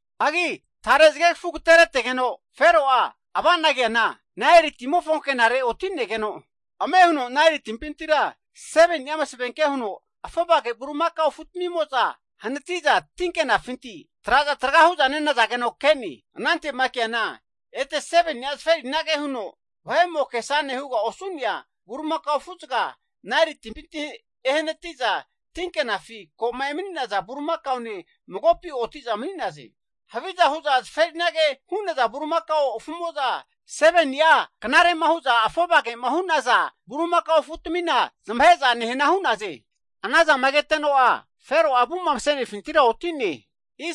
Hagi tare zagegafu agateretegeno Fero'a ava'na keana, Naeli timofo ankenare oti'negeno, ame huno Naeli timpintira 7ni'a masavenke huno afovage Bulimakao afu'tamimo'za hanati'za, tinkenafinti traza tragahu'za nenazageno ke'ne. Anante'ma keana, ete 7ni'a zaferinage huno, vahe'mo kesane huga osu'nea Bulimakao afuzaga Naeli timpinti ehanati'za, tinkenafi ko'ma emani'naza bulimakane magopi oti'za mani'naze. Haviza hu'za zaferinage hu'naza Bulimakao afumo'za, 7ni'a knare'ma hu'za afovage'ma hu'naza Bulimakao afutamina zamahe'za nehana hu'naze. Anazama keteno'a Fero'a avu'ma mase'nefintira oti'ne.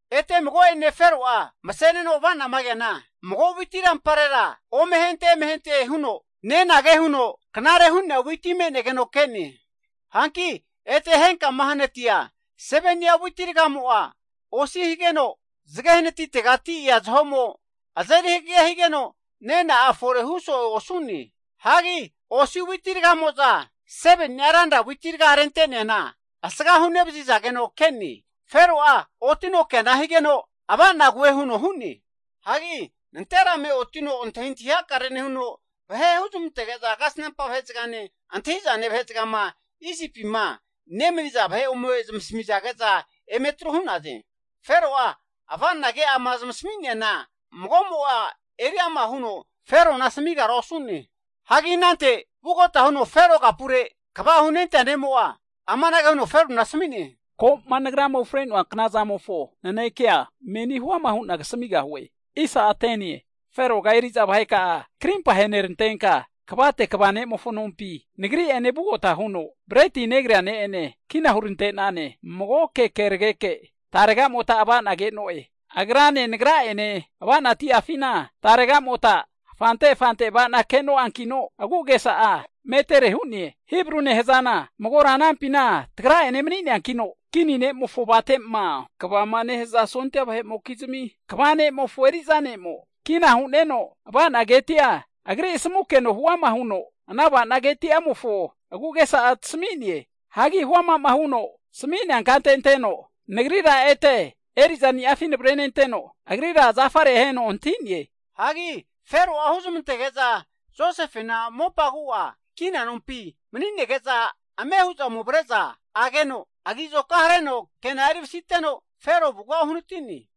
Ete mago'ene Fero'a mase'neno ava'nama keana, mago witi ramparera ome ahente eme ahente huno 7ni'a ranra nenage huno knare hu'nea witi me'negeno ke'ne. Hanki ete henkama hanatia 7ni'a witi raga'amo'a osi higeno, zage hanatitegati ea zaho'mo azeri hagege higeno, nena'a fore hu so'e osu'ne. Hagi osi witi ragamo'za 7ni'a ranra witi raga rente'neana asgahu nevazizageno ke'ne. Fero'a otino keana higeno ava'na koe huno hu'ne. Hagi nanterame otino antahintahi hakare nehuno, vahe huzmantege'za kasnampa vahezagane antahi'zane vahezagama Isipima nemaniza vahe ome zamasamige'za eme atru hu'naze. Fero'a ava'na ke'ama zamasmiana mago'mo'a eriama huno Ferona asamigara osu'ne. Hagi anante vugota huno Fero kapure kva hunentea ne'mo'a amanage huno Ferona asami'ne, Ko'ma nagrama ufre'noa knazamofo nanekea meni huama hu'na kasamigahue. Feroga eri'za vahe ka'a karimpa aherantenka, kavate kva ne'mofo nompi, nagri'ene vugota huno breti negrea ne'ene kina hurante'nane. Magoke kerageke tarega'mota ava'na ke'noe. Agrane nagra'ene, ava'na ti'afina taregamota rurerure av'ana ke'noankino, agu'agesa'a metere hu'ne. Hibru nehazana magora anampina tagra'enena mani'neankino, kinimofo avate'ma kvama nehaza sondia vahe'mokizmi kva ne'mofo eri'za ne'mo kina hu'neno, ava'na keti'a agri asamukeno huama huno ana avana ketiamofo agu'agesa'a tasami'ne. Hagi huama'ma huno tasmi'nea kante anteno nagrira ete eri'zaniafi navrenenteno, agrira zafare aheno hanti'ne. Hagi Fero'a huzmantege'za Josefena mopa agu'a kina nompi mani'nege'za ame hu'za ome avre'za ageno, agi azoka hareno kena'a eri vasiteno, Fero avuga uhanati'ne.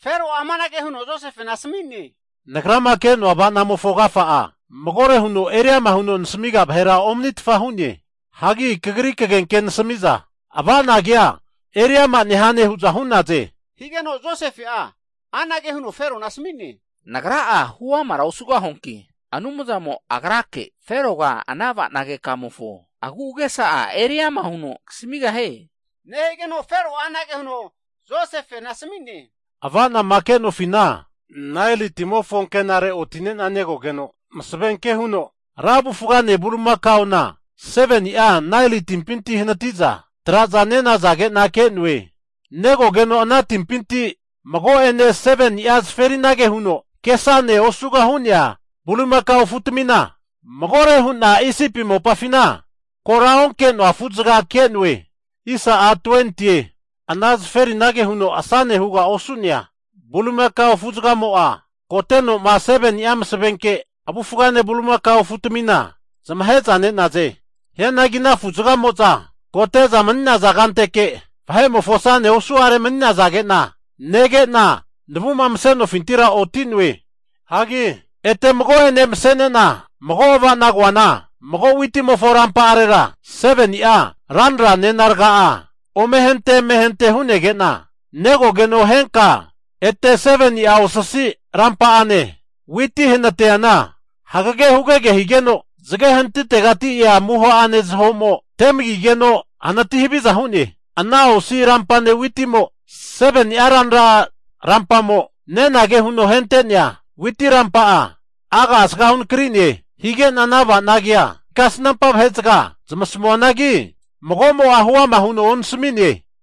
Fero'a amanage huno Josefena asami'ne, Nagrama ke'noa ava'namofo agafa'a, magore huno eriama huno nasmiga vahera omanitfa hu'ne. Hagi kagri kagenke nasami'za, ava'na kea eriama nehane hu'za hu'naze. Higeno Josefe'a anage huno Ferona asami'ne, Nagra'a huamara osugahuanki, Anumzamo agrake Feroga ana avana keka'amofo agu'agesa'a eri ama huno kasamigahie. Nehigeno Fero'a anage huno Josefena asami'ne, Ava'nama ke'nofina, Naeli timofo ankenare, oti'nena negogeno, masavenke huno ra avufgane bulimakaona 7ni'a Naeli timpinti hanati'za traza nenazage'na ke'noe. Negogeno ana timpinti mago'ene 7ni'a zaferinage huno kesane osuga hu'nea bulimakao afutamina, magore hu'na Isipi mopafina kora onke'noa afuzaga ke'noe. Ana zaferinage huno asane huga osu'nea bulimakao afu'zagamo'za koteno'ma 7ni'a masavenke avufgane bulimakao afu'tmina zamahe'za ne'naze. Hianagi ana afu'zagamo'za kote'za mani'naza kanteke vahe'mofo asane osu'are mani'nazage'na nege'na, navu'ma mase'nofintira oti'noe. Hagi ete mago'ane mase'nena mago ava'na koana, mago witimofo rampa'arera, 7ni'a ranra nena raga'a ome ahente eme ahente hu'negena, negogeno henka ete 7ni'a osasi rampa'ane witi hanatiana hagege hugege higeno, zage hanatitegati ea amuho'ane zaho'mo temagigeno hanati haviza hu'ne. Ana osi rampane witimo 7ni'a ranra rampamo nenage huno ahente'nea witi rampa'a, aga asgahu nakri'ne. Hige'na ana ava'nagea kasnampa vahe'zaga zamasmuanagi mago'mo'a huama huno onasmi'ne.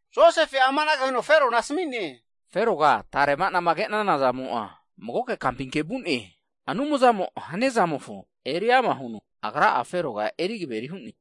Josefe'a amanage huno Ferona asami'ne, Feroga tare ava'nama ke'nana zamo'a magoke kampi vu'ne, Anumzamo hania zamofo eri ama huno Agra'a Feroga eri kaveri hu'ne.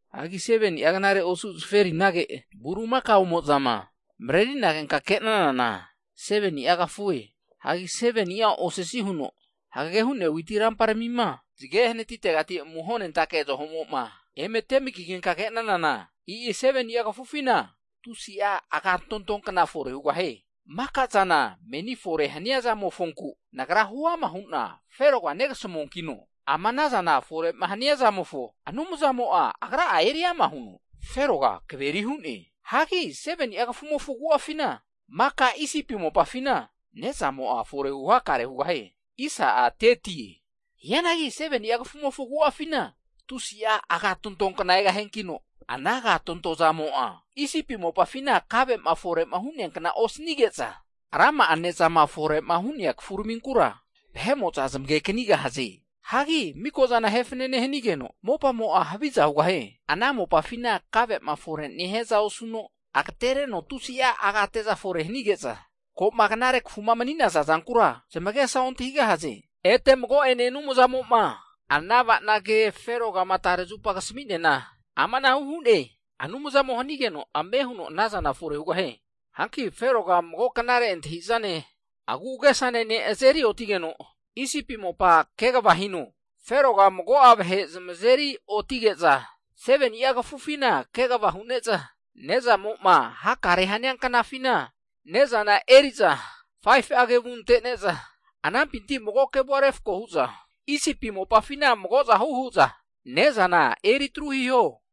Hagi 7ni'a knare osu zaferinage Bulimakaomozama marerinagenka ke'nanana, 7ni'a kafue. Hanki 7ni'a osasi huno hagege hu'nea witi ramparamima zage hanatitegati amuhonentake zaho'moma eme temagigenka ke'nanana, e'i 7ni'a kafufina tusi'a agatonto kna fore hugahie. Maka'zana meni fore hania zamofonku nagra huama huna Feroga negasamuankino, ama anazana fore'ma hania zamofo Anumzamo'a Agra'a eri ama huno Feroga kaveri hu'ne. Hagi 7ni'a kafumofo agu'afina, maka Isipi mopafina, ne'zamo'a fore huhakare hugahie. Hianagi 7ni'a kafumofo agu'afina tusi'a agatonto kna egahiankino, ana agatonto zamo'a Isipi mopafina kave'ma fore'ma hu'nea kna osanige'za, rama'a ne'zama fore'ma hu'nea kafuraminkura vahe'mo'za zamage kanigahaze. Hagi miko'zana ahe fanane hanigeno, mopamo'a haviza hugahie. Ana mopafina kave'ma fore nehiaza osuno, agatereno tusi'a agate'za fore hanige'za, ko'ma knare kafuma mani'naza zankura zamagesa ontahigahaze. Ete mago'ene Anumzamo'ma ana ava'na ke Ferogama tare zupa kasmi'neana amanahu hu'ne, Anumzamo hanigeno ame huno anazana fore hugahie. Hanki Feroga mago knare antahi'zane, agu'agesane ne' azeri otigeno Isipi mopa kegava hino. Feroga mago'a vahe zamazeri otige'za, 7ni'a kafufina kegava hu'ne'za, ne'zamo'ma hakare hania knafina ne'zana eri'za 5fu'a kevu ante'ne'za anampinti mago kevua refko hu'za Isipi mopafina mago'zahu hu'za ne'zana eritru hiho.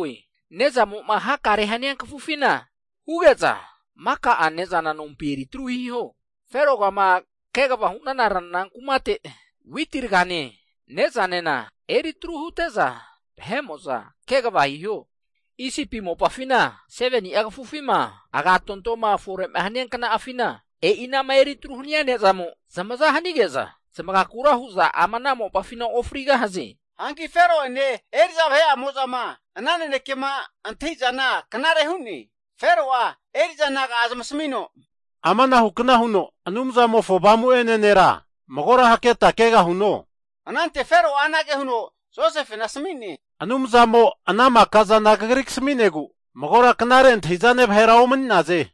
Ne'zamo'ma hakare hania kafufina huge'za, maka'a ne'zana nompi eri tru hiho. Ferogama kegava hu'nana ranra kumate witi ragane ne'zanena eritru hute'za, vahe'mo'za kegava hiho. Isipi mopafina 7ni'a kafufima agatontoma fore'ma hania kna'afina, e'i anama eritru hania nezamo zamaza hanige'za, zamagakura hu'za ama ana mopafina ofrigahaze. Hanki Fero'ene eri'za vahe'amozama ana nanekema antahi'zana knare hu'ne. Fero'a eri'za naga'a zamasmino, Amanahukna huno, Anumzamofo Avamu'ene nera magora hakreta kegahuno? Anante Fero'a anage huno Josefena asmi'ne, Anumzamo ana maka'zana kagri kasmi'negu, magora knare antahi'zane vahera omani'naze.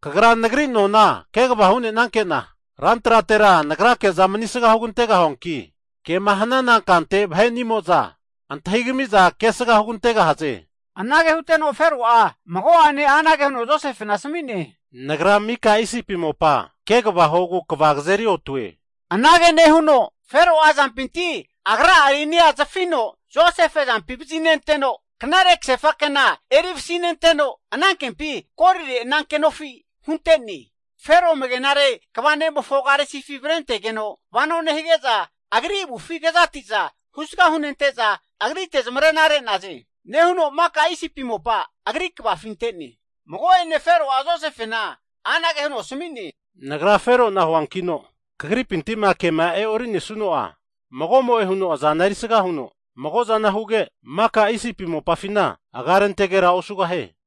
Kagra nagri nona kegava hunenankena, ran tratera nagrake'za manisga hugantegahuanki, kema hanana kante vahenimo'za antahi kami'za kesga hugantegahaze. Anage huteno Fero'a mago'ane anage huno Josefena asami'ne, Nagra mika Isipi mopa kegava huogu kva kazeri otue. Anage nehuno Fero'a azampinti agra'a rinia zafino Josefe azampi vazinenteno, knare kasefa kena eri vasinenteno, anankempi golire ananke nofi hunte'ne. Fero amagenare kva ne'mofo karisifi avrentegeno vano nehige'za, agri avufi kezati'za husga hunente'za, agrite zamarena re'naze! Nehuno maka Isipi mopa agri kvafi ante'ne. Mago'ene, Fero'a Josefena anage huno asmi'ne, Nagra Fero'na huankino kagripinti'ma kema e'orinesuno'a, mago'mo'e huno azana erisga huno mago'zana huge, maka Isipi mopafina aga rentegera osugahie.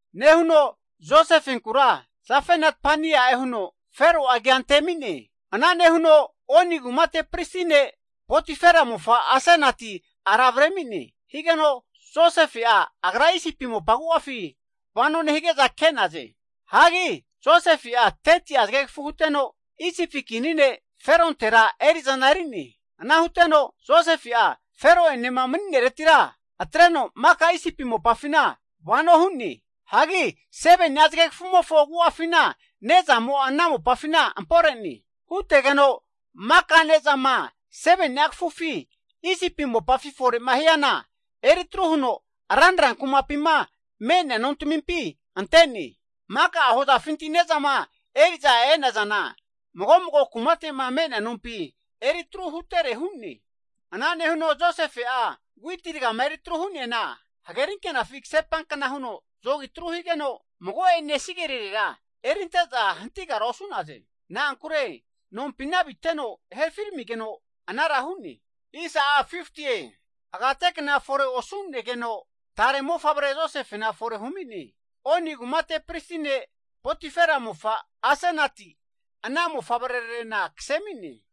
Nehuno Josefenkura Zafenat-panea'e huno Fero'a agi'a antemine. Ana nehuno Oni kumate pristi ne' Potifera mofa Asenati ara avremine. Higeno Josefe'a agra Isipi mopa agu'afi vano nehige'za ke'naze. Hagi Josefe'a 30'a Zagegafu huteno, Isipi kini ne' Ferontera eri'zana eri'ne. Ana huteno Josefe'a Fero enema mani'neretira atreno maka Isipi mopafina vano hu'ne. Hagi 7ni'a zagegafumofo agu'afina ne'zamo'a ana mopafina ampore'ne. Hutegeno maka ne'zama 7ni'a kafufi Isipi mopafi fore'ma hiana eritru huno ranra kumapima me'nea nontamimpi ante'ne. Maka'a hozafinti ne'zama eri'za e'nazana, mago mago kumate'ma me'nea nompi eri atru hutere hu'ne. Ana nehuno Josefe'a witi rgama eritru hu'neana, hagerinkenafi kasepankna huno zogi atru higeno, mago'ene sigerirera erinte'za hantigara osu'naze. Na'ankure nompina aviteno herafi ramigeno anara hu'ne. Agate kna fore osu'negeno, tare ne'mofavre Josefena fore humi'ne. Oni kumate pristi ne' Potifera mofa Asenati ana mofavrerarena kase ami'ne.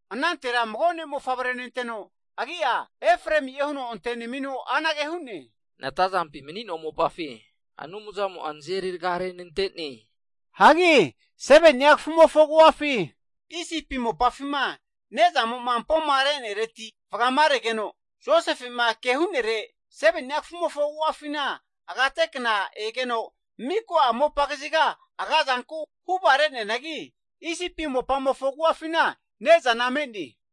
Anantera mago ne'mofavre nenteno agi'a, Efraemi'e huno antenemino anage hu'ne, natazampi mani'noa mopafi Anumzamo nazeri raga renante'ne. Hagi 7ni'a kafumofo agu'afi Isipi mopafima ne'zamo'ma ampomare'nereti vagaregeno, Josefe'ma ke hu'nere, 7ni'a kafumofo agu'afina agate kna egeno miko'a mopa kaziga aga'zanku huva re'neanagi, Isipi mopamofo agu'afina ne'zana me'ne.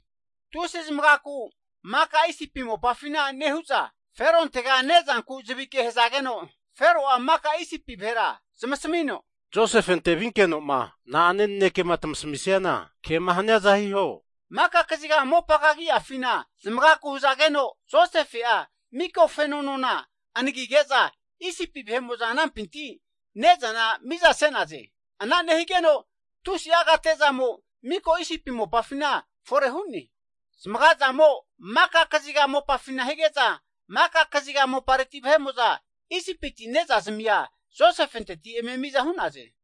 Tusi zamagazanku maka Isipi mopafina nehu'za, Ferontega nezanku zavike hazageno, Fero'a maka Isipi vahera zamasmino, Josefente vinkeno'ma na'ane nanekema tmasmisiana kema haniaza hiho. Maka kaziga mopa kagi'afina zamagaku hazageno, Josefe'a mika feno nona anagige'za Isipi vahe'mo'za anampinti ne'zana miza se'naze. Ana nehigeno tusi'a agate'zamo miko Isipi mopafina fore hu'ne. Zamagazamo maka kaziga mopafina hige'ze maka kaziga mopareti vahe'mo'za, Isipiti witi ne'zazmia Josefenteti eme miza hu'naze.